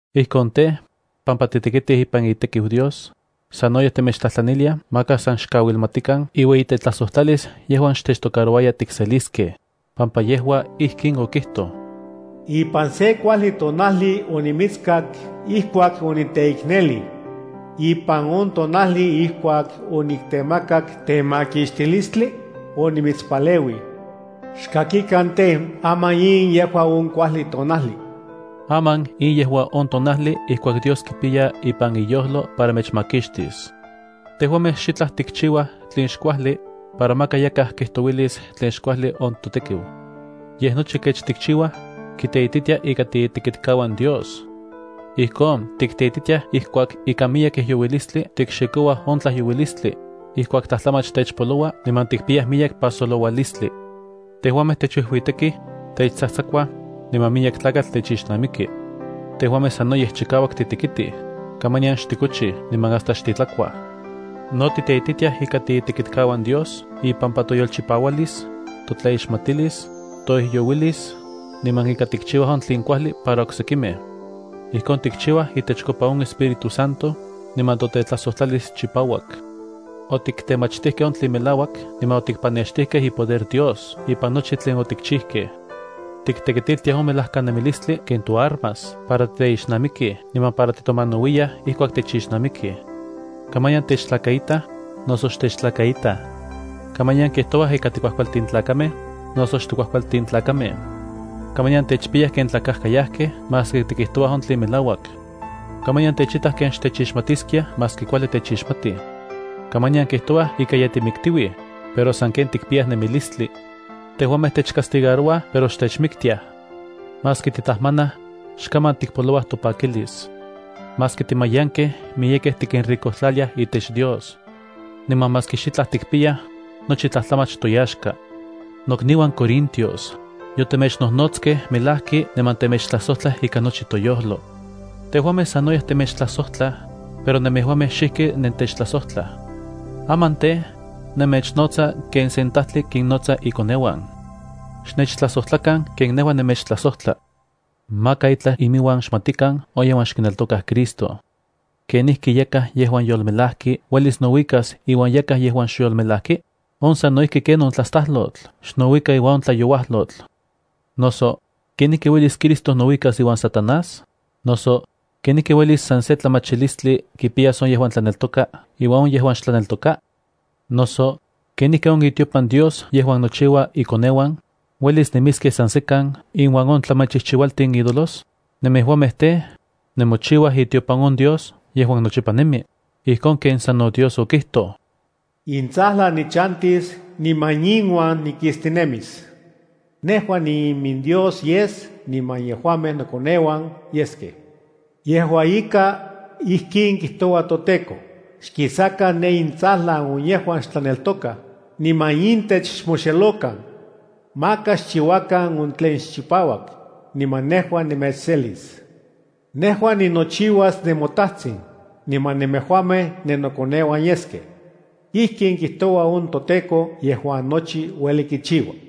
Ijkon tej, pampa titekitij ipan itekiu Dios, sanoyej temechtlajtlaniliaj maka san xkauilmatikan iueyitetlajsojtlalis yejuan xtechtocarouaya tikseliskej, pampa yejua ijkin okijtoj: Ipan sen kuajli tonajli onimitskak ijkuak oniteiknelij. Ipan on tonajli ijkuak oniktemakak temakixtilistli, onimitspaleuij. Xkakikan tej, aman in yejua on kuajli tonajli. Aman in yejua on tonajli ijkuak Dios kipiya ipan iyojlo para mechmakixtis. Tejuamej xitlaj tikchiuaj tlen xkuajli, para maka yakaj kijtouilis tlen xkuajli on totekiu. Yej, nochi kech tikchiuaj, kiteititia ika tiitekitkauan Dios. Ijkon, titeititiaj ijkuak ikan miyek ijyouilistli tikxikouaj on tlajyouilistli, ijkuak tlajtlamach techpoloua niman tikpiyaj miyek pajsoloualistli. Tejuamej techuijuitekij, techtsajtsakuaj, niman miyek tlakatl techixnamiki. Tejuamej sanoyej chikauak titekitij, kamanian xtikochij niman hasta xtitlakuaj. No tikteititiaj ika tiitekitkauan Dios ipampa toyolchipaualis, totlaixmatilis, toijyouilis, niman ika tikchiuaj on tlen kuajli para oksekimej. Ijkon tikchiuaj itechkopa on Espíritu Santo, niman totetlajsojtlalis chipauak. Otiktemachtijkej on tlen melauak niman otikpanextijkej ipoder Dios ipan nochi tlen otikchijkej. Tiktekitiltiaj on melajkanemilistli ken toarmas para titeixnamikij niman para titomanauiyaj ijkuak techixnamikij. Kamanian techtlakaitaj, noso xtechtlakaitaj. Kamanian kijtouaj ika tikuajkualtin tlakamej, noso xtikuajkualtin tlakamej. Kamanian techpiyaj ken tlakajkayajkej maski tikijtouaj on tlen melauak. Kamanian techitaj ken xtechixmatiskiaj maski kuajli techixmatij. Kamanian kijtouaj ika ye timiktiuij, pero sanken tikpiyaj nemilistli. Tejuamej techcastigarouaj pero xtechmiktiaj. Maski titajmanaj, xkaman tikpolouaj topakilis. Maski timayankej, miyekej tikinricojtlaliaj itech Dios. Niman maski xitlaj tikpiyaj, nochi tlajtlamach toyaxka. Nokniuan corintios, yotemechnojnotskej melajki niman temechtlajsojtlaj ikan nochi toyojlo. Tejuamej sanoyej temechtlajsojtlaj, pero nemejuamej xijki nentechtlajsojtlaj. Aman tej, nemechnotsa ken sen tajtli kinnotsa ikoneuan. Xnechtlajsojtlakan ken nejua nemechtlajsojtla. Maka itlaj iminuan xmatikan on yejuan xkineltokaj Cristo. ¿Kenijki yakaj yejuan yolmelajki uelis nouikas iuan yakaj yejuan xyolmelajki? On sano ijki ken on tlastalotl xnouika iuan on tlayouajlotl. Noso, ¿kenijki uelis Cristo nouikas iuan Satanás? Noso, ¿kenijki uelis san se tlamachilistli kipiyas on yejuan tlaneltoka iuan on yejuan xtlaneltoka? Noso, ¿kenijki on itiopan Dios yejuan nochiua ikoneuan, uelis nemiskej san sekan inuan on tlamachijchiualtin ídolos? Nemejuamej tej, nemochiuaj itiopan on Dios yejuan nochipa nemi, ijkon ken sano Dios okijtoj: Intsajlan nichantis niman inuan nikistinemis. Nejua niiminDios yes niman yejuamej nokoneuan yeskej. Yejua ika, ijkin kijtoua toTEKO: Xkisakan ne intsajlan on yejuan xtlaneltokaj, niman intech xmoxelokan. Maka xchiuakan on tlen xchipauak, niman nejua nemechselis. Nejua ninochiuas nemoTajtsin, niman nemejuamej nennokoneuan yeskej. Ijkin kijtoua on toTEKO nochi ueli kichiua.